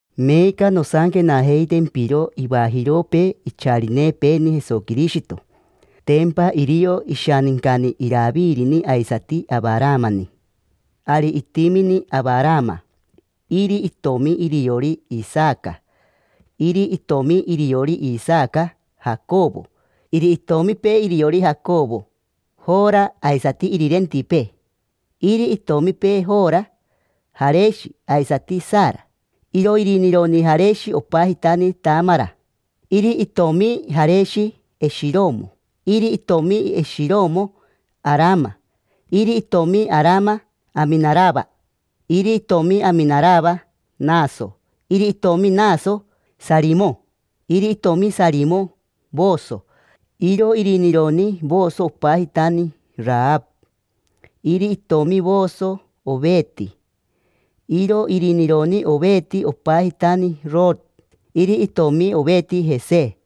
Meeca nosanquenajeitempiro ivajiropee icharinepeeni Jesoquirishito. Tempa irio ishanincani Iravirini aisati Avaramani. Ari itimini Avarama. Iri itomi iriori: Isaca. Iri itomi iriori Isaca: Jacovo. Iri itomipee iriori Jacovo: Jora aisati irirentipee. Iri itomipee Jora: Jareshi aisati Sara. Iro irinironi Jareshi opajitani Tamara. Iri itomi Jareshi: Eshiromo. Iri itomi Eshiromo: Arama. Iri itomi Arama: Aminarava. Iri itomi Aminarava: Naso. Iri itomi Naso: Saramo. Iri itomi Saramo: Voso. Iro irinironi Voso opajitani Arava. Iri itomi Voso: Overe. Iro irinironi Overe opajitani Oroto. Iri itomi Overe: Jese.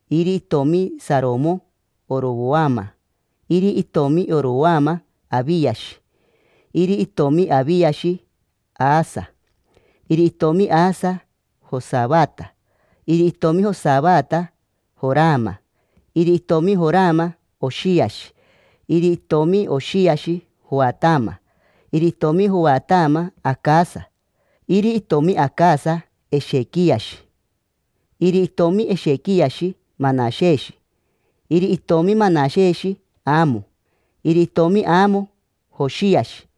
Iri itomi Saromo: Orovoama. Iri itomi Orovoama: Aviashi. Iri itomi Aviashi: Asa. Iri itomi Asa: Josavata. Iri itomi Josavata: Jorama. Iri itomi Jorama: Oshiashi. Iri itomi Oshiashi: Joatama. Iri itomi Joatama: Acasa. Iri itomi Acasa: Eshequiashi. Iri itomi Eshequiashi: Manasheshi. Iri itomi Manasheshi: Amo. Iri itomi Amo: Joshiashi.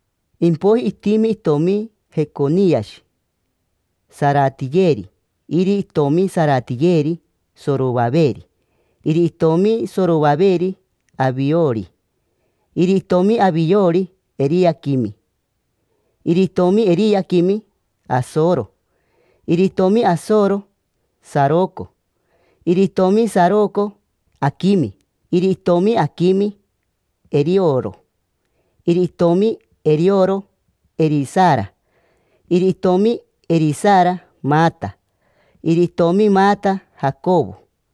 Impoiji itimi itomi Jeconiashi: Saratiyeri. Iri itomi Saratiyeri: Sorovaveri. Iri itomi Sorovaveri: Aviori. Iri itomi Aviori: Eriaquimi. Iri itomi Eriaquimi: Asoro. Iri itomi Asoro: Saroco. Iri itomi Saroco: Aquimi. Iri itomi Aquimi: Erioro. Iri itomi Erioro: Erisara. Iri itomi Erisara: Mata. Iri itomi Mata: Jacovo.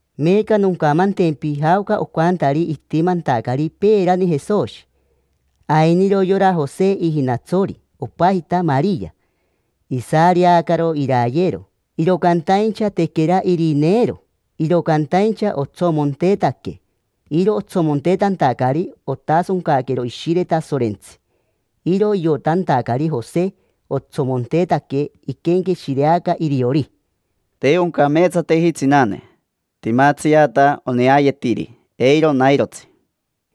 Meeca noncamantempi jaoca ocantari itimantacari peerani Jesoshi. Ainiro yora Jose ijinatsori, opajita Maria. Isareacaro irayero, iro cantaincha tequera irineero. Iro cantaincha otsomontetaque: iro otsomontetantacari otasoncaquero Ishire Tasorentsi. Iro iotantacari Jose otsomontetaque, iquenqueshireaca iriori: “Te oncameetsateji tsinane. Timatsiata oneayetiri. Eiro nairotsi”.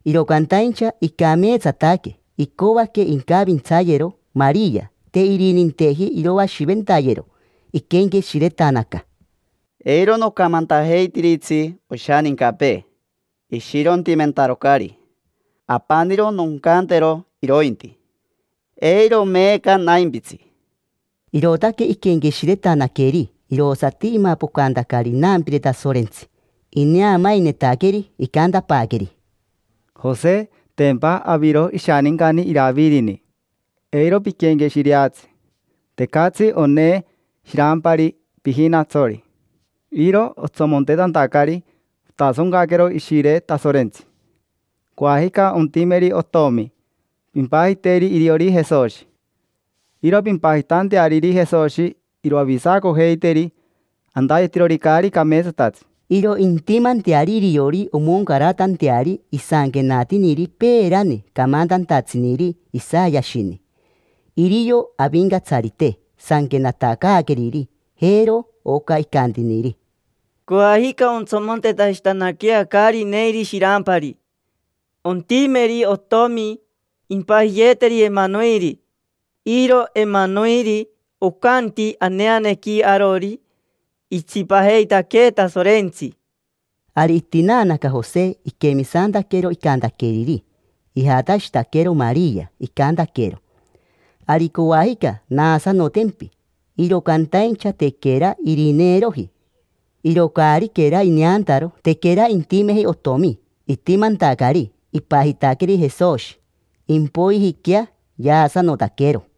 Iro cantaincha icameetsataque, icoaque incavintsayero Maria, te irininteji iroashiventayero; iquenqueshiretanaca: “Eiro nocamantajeitiritsi oshanincapee, ishirontimentarocari. Apaniro noncantero irointi: ‘Eiro meeca naimpitsi’”. Irootaque iquenqueshiretanaqueri, irosati imapocantacari inampire Tasorentsi, ineamainetaqueri. Icantapaaqueri: —Jose, tempa aviro ishanincani Iravirini, eiro piquenqueshireatsi. Tecatsi onee shirampari pijinatsori. Iro otsomontetantacari otasoncaquero Ishire Tasorentsi. Coajica ontimeri otomi, pimpajiteri iriori Jesoshi. Iro pimpajitanteariri Jesoshi iroavisacojeiteri antayetirori caari cameetsatatsi. Iro intimanteari iriori omoncaratanteari isanquenatiniri peerani camantantatsiniri Isayashini. Irio Avincatsarite sanquenatacaaqueriri. Jero oca icantiniri: “Coajica ontsomontetashitanaquea caari neiri shirampari, ontimeri otomi. Impajiyeeteri Emanoere”. Iro Emanoere ocanti aneanequi arori: “Itsipajeitaquee Tasorentsi”. Ari itinaanaca Jose, iquemisantaquero icantaqueriri. Ijatashitaquero Maria, icantaquero: —Ari coajica naasanotempi. Iro cantaincha tequera irineeroji: iro caariquera ineantaro, tequera intimeji otomi. Itimantacari, ipajitaqueri Jesoshi. Impoijiquea yaasanotaquero.